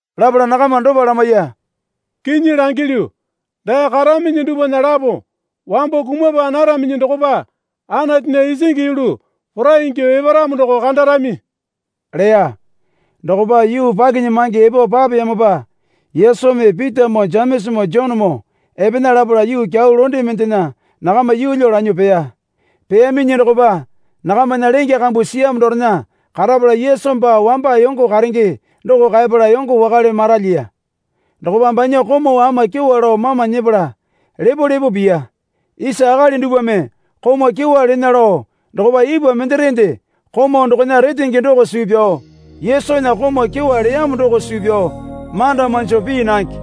Lapala nakama dopa lamaiya. Kinyi langilyu, dae karaminyi dupwana lapo wambo kumapa naraminyi dokopa Anatunya isingi yulu porai ingyuo eparamo doko kandarami, leya. Dokopa yuu pakinyamange epo papeyamopa Yesumi Pitamoo Jemesamoo Jonemoo epena lapala yuu kyau londe mendena nakama yeelyo lanyuo peya. Peyaminyi dokopa nakamana lenge kambu siyamo dorena karapala Yesu baa wamba yongo karenge doko kaepala yongo wakale maralyiya. Dokopa banya komau ama kyewa lao mama nyepala lepo lepo piya. Isa akali dupwame komau kyewa lena lao dokopa ipwa menderekende komau dokona retenge doko suu pyao Yesunya komau kyewa leyamo doko suu pyao manda manjo pii nange.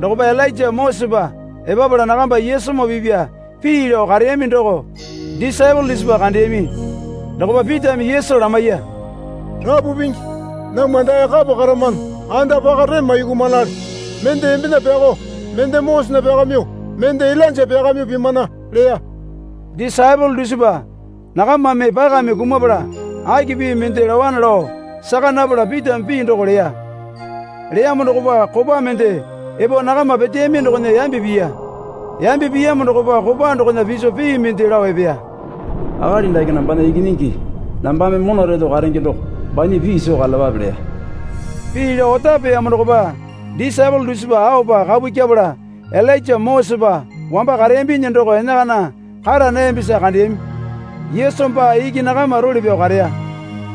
Dokopa Ilainja Mosesepa epapala nakamba Yesumoo pipya pii lao kareyami doko disaepole dusipa kandeyami. Dokopa Pitame Yesu lamaiya. Rapu Pingi, namwa dae kapa karamano. Anda paka rema yukumanale. Mende embena pyakao mende Mosesena pyakamyuo, mende Ilainja pyakamyuo pimana, leya. Disaepole dusipa nakamame pakame kumapala aki pii mende laowane lao saka napala Pitame pii doko leya. Leyamo dokopa kopa mende epo nakama peteyami dokona yambe piya. Yambe piyamo dokopa kopa dokona piso pii mende lao epeya. Akali dake nambana Ikinyingi nambame mona reto karenge doko. Banya pii soo karalapape, leya. Pii lao otapeyamo dokopa disaepole dusipa aopa kapu kyepala Ilainja Mosesepa wamba kareyambinyi doko enakana kara nayambisa kandeyami Yesu baa iki nakama role pyao kareya.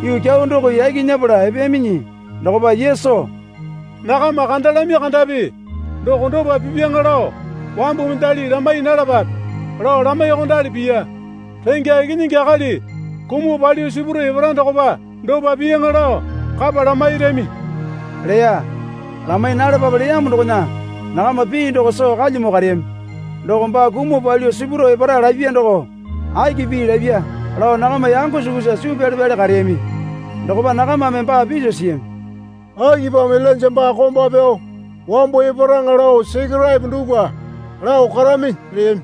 Yuu kyau doko yaki nyepala epeyaminyi dokopa Yesu, Nakama kandalami kandapi doko dopa pipyaŋa lao wambu mendali lamai nalapape, lao lamaiyuokondali piya. Rengya Ikinyingi Akali kumuo palyuo sipuro epara dokopa dopa piyaŋa lao kapa lamairami, leya. Lamai nalapape leyamo dokona nakama pii doko soo kalyamo kareyami. Doko baa kumuo palyuo sipuro epara lapya doko aki pii lapya lao nakama yango sukusa suu pyale pyale kareyami. Dokopa nakamame baa piso siyami. Akipamo Ilainja baa komba pyao wambo eparaŋa lao Sekeraepo dupwa lao karaminyi? leyami.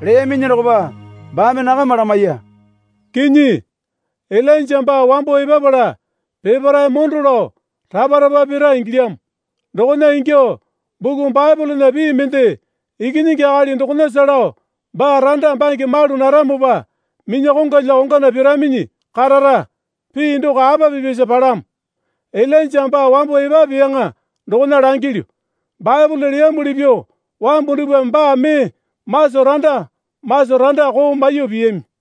Leyaminyi dokopa baame nakama lamaiya. Kinyi, Ilainja baa wambo epapala peparae mondo lao rapa rapa pira ingilyamo. Dokona ingyuo buku Baepolena pii mende Ikinyingi Akali dokonasa lao baa randa bange malu naramopa minya kongwalya kongwana piraminyi karara, pii doko apa pipyasa palamo? Ilainja baa wambo epapeyaŋa dokona langilyu. Baepole leyamuli pyuo wambu dupwame baa mee maso randa maso randa koo maiyuo piyami.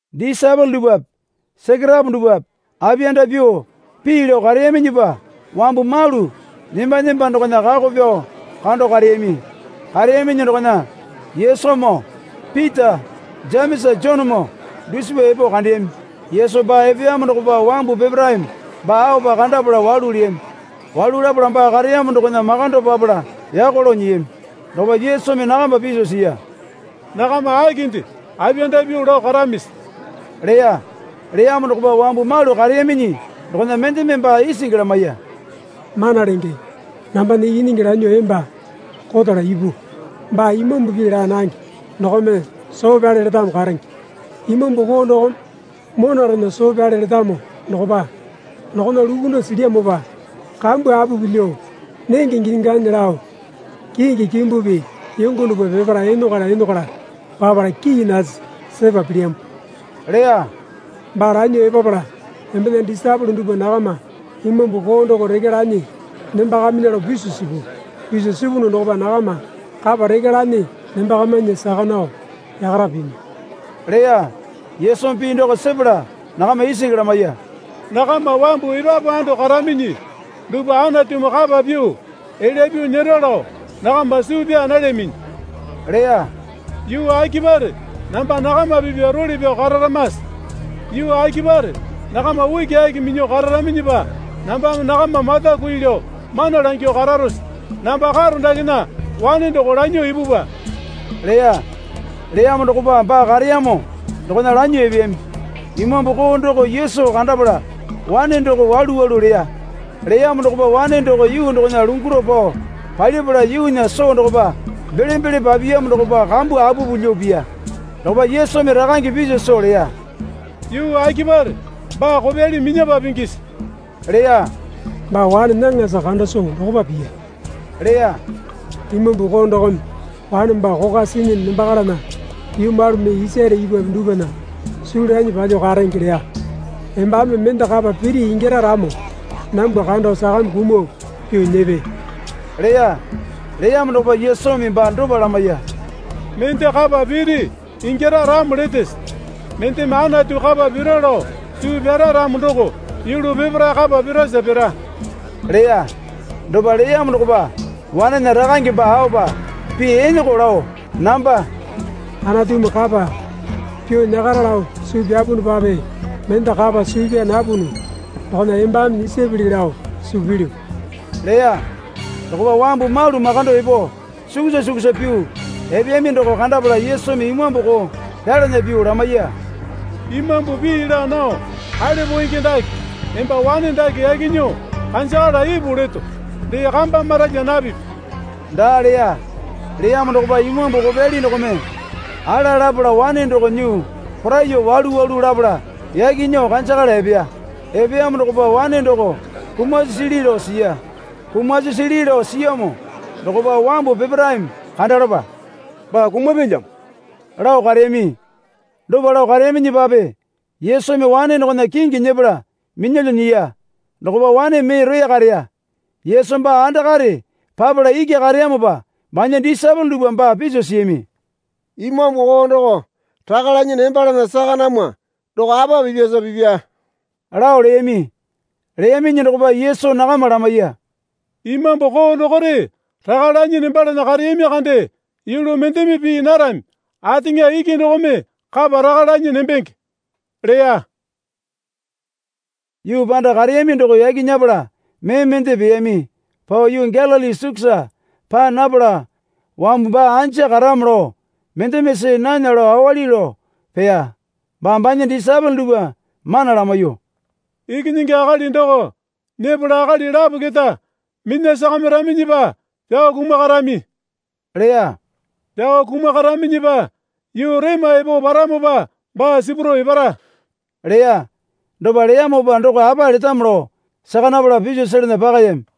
Disaepole dupwape Sekeraepo dupwape apiyanda pyuo pii lao kareyaminyipa wambu malu nemba nemba dokona kako pyao kando kareyami. Kareyaminyi dokona Yesumoo Pita Jemesa Jonemoo dusipa epo kandeyami. Yesu baa epeyamo dokopa wambu peparaeme baa aopa kandapala walu leyami. Walu lapala baa kareyamo dokona makando papala yako lao nyiyami. Dokopa Yesumi nakama piso siya. Nakama akinde apiyanda pyuo lao karamisi? leya. Leyamo dokopa wambu malu kareyaminyi dokona mendeme baa isingi lamaiya. Mana Lenge, nambana ikinyingi lanyuo emba kotala ipu. Baa imambu pii laa nange dokome soo pyale letamo karenge. Imambu koo dokome monarena soo pyale letamo dokopa dokona lukunduo silyamopa kambu apupu lyuo, nenge ginyi ganyi lao kingi kimbupi yongo dupwa peparae enokwala enokwala papala kii nasi sepa pilyamo, leya. Baa lanyuo epapala embena disaepole dupwa nakama imambu koo doko rekya lanyi nembakamainya lao piso sipu. Piso sipunu dokopa nakama kapa rekya lanyi nembakamainya saka nao yakara pimi, leya. Yesumi pii doko sepala nakama isingi lamaiya. Nakama wambu epapu ando karaminyi dupwa Anatumi kapa pyuo elya pyuo nyera lao nakama suu pyaa nalyaminyi, leya. Yuu akipare namba nakama pipya role pyao kararamase? Yuu akipare nakama ukiaki minyuo kararaminyipa nambame nakama mata kui lao mana langyuo kararose? Namba karo dakena wane doko lanyuo ipupwa, leya. Leyamo dokopa baa kareyamo dokona lanyuo epeyami. Imambu koo doko Yesu kandapala wane doko walu walu leya. Leyamo dokopa wane doko yuu dokona lunguro pao palipala yuunya soo dokopa belembele papiyamo dokopa kambu apupu lyuo piya. Dokopa Yesumi rakange piso soo leya. Yuu akipare baa kopyali minyapa pingisi? leya. Baa wane nyaŋasa kanda soo dokopa piya, leya. Imambu koo dokome wane baa kokwa sinyi nembakalana yuu malu mee isare ipwape dupwana suu lanyi palyuo karenge, leya. Embame mende kapa piri ingyara ramo nambwa kando sakame kumuo pyuo nyepe, leya. Leyamo dokopa Yesumi baa dopa lamaiya. Mende kapa piri ingyara ramo letese? Mendeme Anatu kapa pira lao suu pyara ramo doko yulu peparae kapa pirasa pira, leya. Dopa leyamo dokopa wanena rakange baa aopa pii eneko lao namba Anatumi kapa pyuo nyakara lao suu pyapunupape mende kapa suu pyaa napunu dokona embame nyisapili lao suu pilyu, leya Dokopa wambu malu makando epo sukusa sukusa pyuo epeyami doko kandapala Yesumi imambu koo pyalana pyuo lamaiya. Imambu pii laa nao kale poenge dake, emba wane dake yaki nyuo kanjakala ipu leto, Dee kamba maralya napipi, daa leya. Leyamo dokopa imambu kopyali dokome ala lapala wane doko nyuo poraiyuo walu walu lapala yaki nyuo kanjakala epeya. Epeyamo dokopa wane doko kumasi sili lao siya. Kumasi sili lao siyamo dokopa wambu peparaeme kandalapa, Baa kumapyalyamo, lao kareyami. Dopa lao kareyaminyipape Yesumi wane dokona kingi nyepala minyalyuo nyiya. Dokopa wane mee roya kareya. Yesu baa andakare papala iki kareyamopa banya disaepole dupwa baa piso siyami. Imambu koo doko raka lanyi nembalana saka namwa doko apa pipyasa pipya? lao leyami. Leyaminyi dokopa Yesu nakama lamaiya. Imambu koo dokore raka lanyi nembalana kareyami kande yulu mendeme pii narami. Ateŋa iki dokome kapa raka lanyi nembenge, leya. Yuu panda kareyami doko yaki nyepala mee mende peyami. Pao yuu Galili sukusa paa napala wambu baa anja karamo lao mendeme see nana lao awali pyuo peya. Baa banya disaepole dupwa mana lamaiyuo, Ikinyingi Akali doko nyepala akali lapo keta minya sakamiraminyipa pyao kumakarami, leya. Pyao kumakaraminyipa yuu rema epo paramopa baa sipuro epara, leya. Dopa leyamopa doko apa letamo lao saka napalape piso selana pakayami.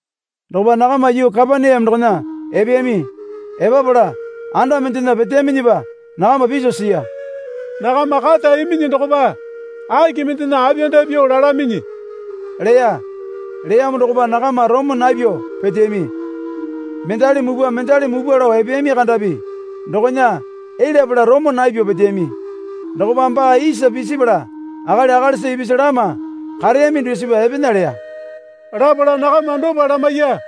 Dokopa nakama yuu Kapaneame dokona epeyami. Epapala anda mendena peteyaminyipa nakama piso siya. Nakama kata iminyi dokopa aki mendena apiyanda pyuo lalaminyi? leya. Leyamo dokopa nakama romo napyuo peteyami. Mendali mupwa mendali mupwa lao epeyami kandapi dokona elyapala romo napyuo peteyami. Dokopa baa isa pisipala akali akalisa ipisu lama kareyami dusipa epena leya. Lapala nakama dopa lamaiya.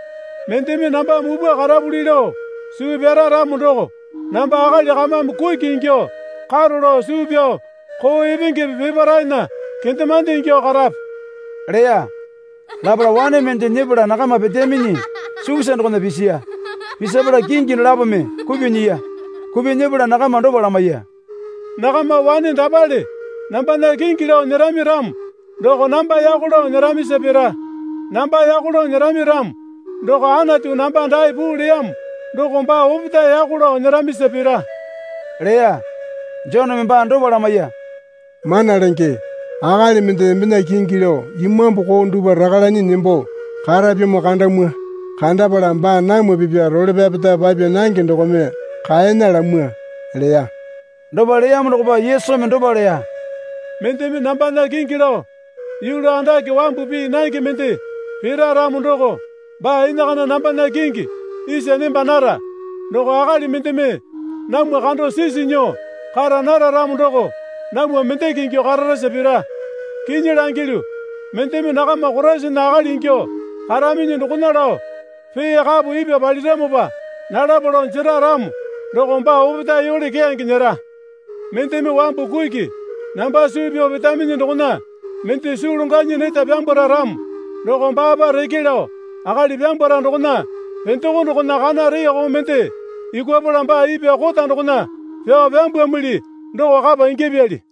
Mendeme namba mupwa karapuli lao suu pyara ramo doko namba akali kamame kuki ingyuo karo lao suu pyao koo epengepe peparaena kendemande ingyuo karape, leya. Lapala wane mende nyepala nakama peteyaminyi sukusa dokona pisiya. Pisapala kingi dolapome kupyuo nyiya. Kupyuo nyepala nakama dopa lamaiya. Nakama wane dapale nambana kingi lao nyerami ramo doko namba yako lao nyeramisa pira. Namba yako lao nyerami ramo doko Anatu namba dae puu leyamo doko baa opetae yako lao nyeramisa pira, leya. Joneme baa dopa lamaiya. Mana Lenge, akali mende embena kingi lao imambu koo dupwa raka lanyi nembo karapyamo kandamwa. Kandapala baa namwa pipya role pyapeta papya nange dokome kaena lamwa, leya. Dopa leyamo dokopa Yesu dopa leya. Mendeme nambana kingi lao yulu andake wambu pii nange mende pira ramo doko baa enakana nambana kingi isa nemba nara. Doko akali mendeme namwa kando sisi nyuo kara nara ramo doko namwa mendeke ingyuo kararasa pira. Kinyi langilyu, mendeme nakama Koraisana akali ingyuo karaminyi dokona lao pee kapo ipwa paliramopa nalapa lao jera ramo doko baa opetae yole keyange nyera. Mendeme wambu kuki namba suu pyao petaminyi dokona mende suu longwanyi neta pyambwara ramo doko baapa reke lao akali pyambwara dokona pendoko dokona kana reeko mende yukwapala baa ipwa kota dokona pyao pyambwamili doko kapa ingyapyali.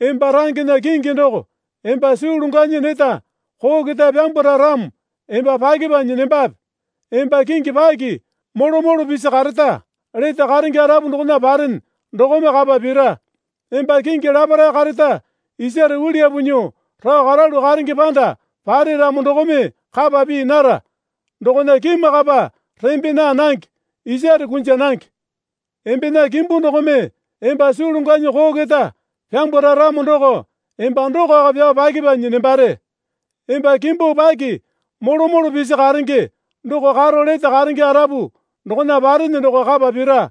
Emba rangena kingi doko emba suu longwanyi neta koo keta pyambwara ramo emba pyakepanyi nembape. Emba kingi paki molo molo pisi kareta lete karenge arapu dokona parene dokome kapa pira. Emba kingi laparae kareta isare uliyapu nyuo rao karalu karenge panda pare ramo dokome kapa pii nara. Dokona kimakapa rembe naa nange, isare kunja nange. Embena kimbu dokome emba suu longwanyi koo keta pyambwara ramo doko emba dokoko pyao pyakepanyi nembare. Emba kimbu paki molo molo pisi karenge doko karo lete karenge arapu dokona parene doko kapa pira.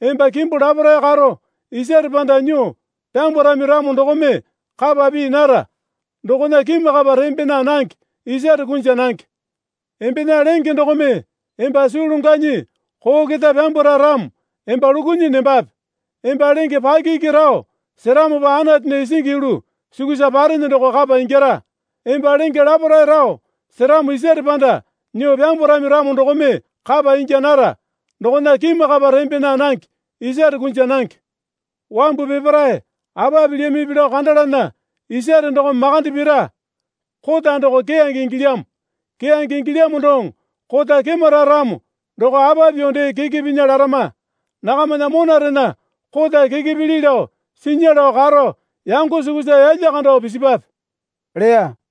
Emba kimbu laparae karo isare panda nyuo pyambwarami ramo dokome kapa pii nara. Dokona kimakapa rembe naa nange isare kunja nange. Embena lenge dokome emba suu longwanyi koo keta pyambwara ramo emba lukunyi nembape. Emba lenge paki iki rao seramo Anatunya isingi yulu sukusa parene doko kapa ingyara. Emba lenge laparae rao seramo isare panda nyuo pyambwarami ramo dokome kapa ingya nara. Dokona kimakapa rembe naa nange, isare kunja nange. Wambu peparae apa pilyamipi lao kandalana isare dokome makande pira. Kota doko keyange ingilyamo. Keyange ingilyamo doŋo kota kemara ramo doko apa pyuo dee keke pinya larama? Nakamana monarena kota keke pili lao sinya lao karo yango sukusa yalya kando pisipwape, leya.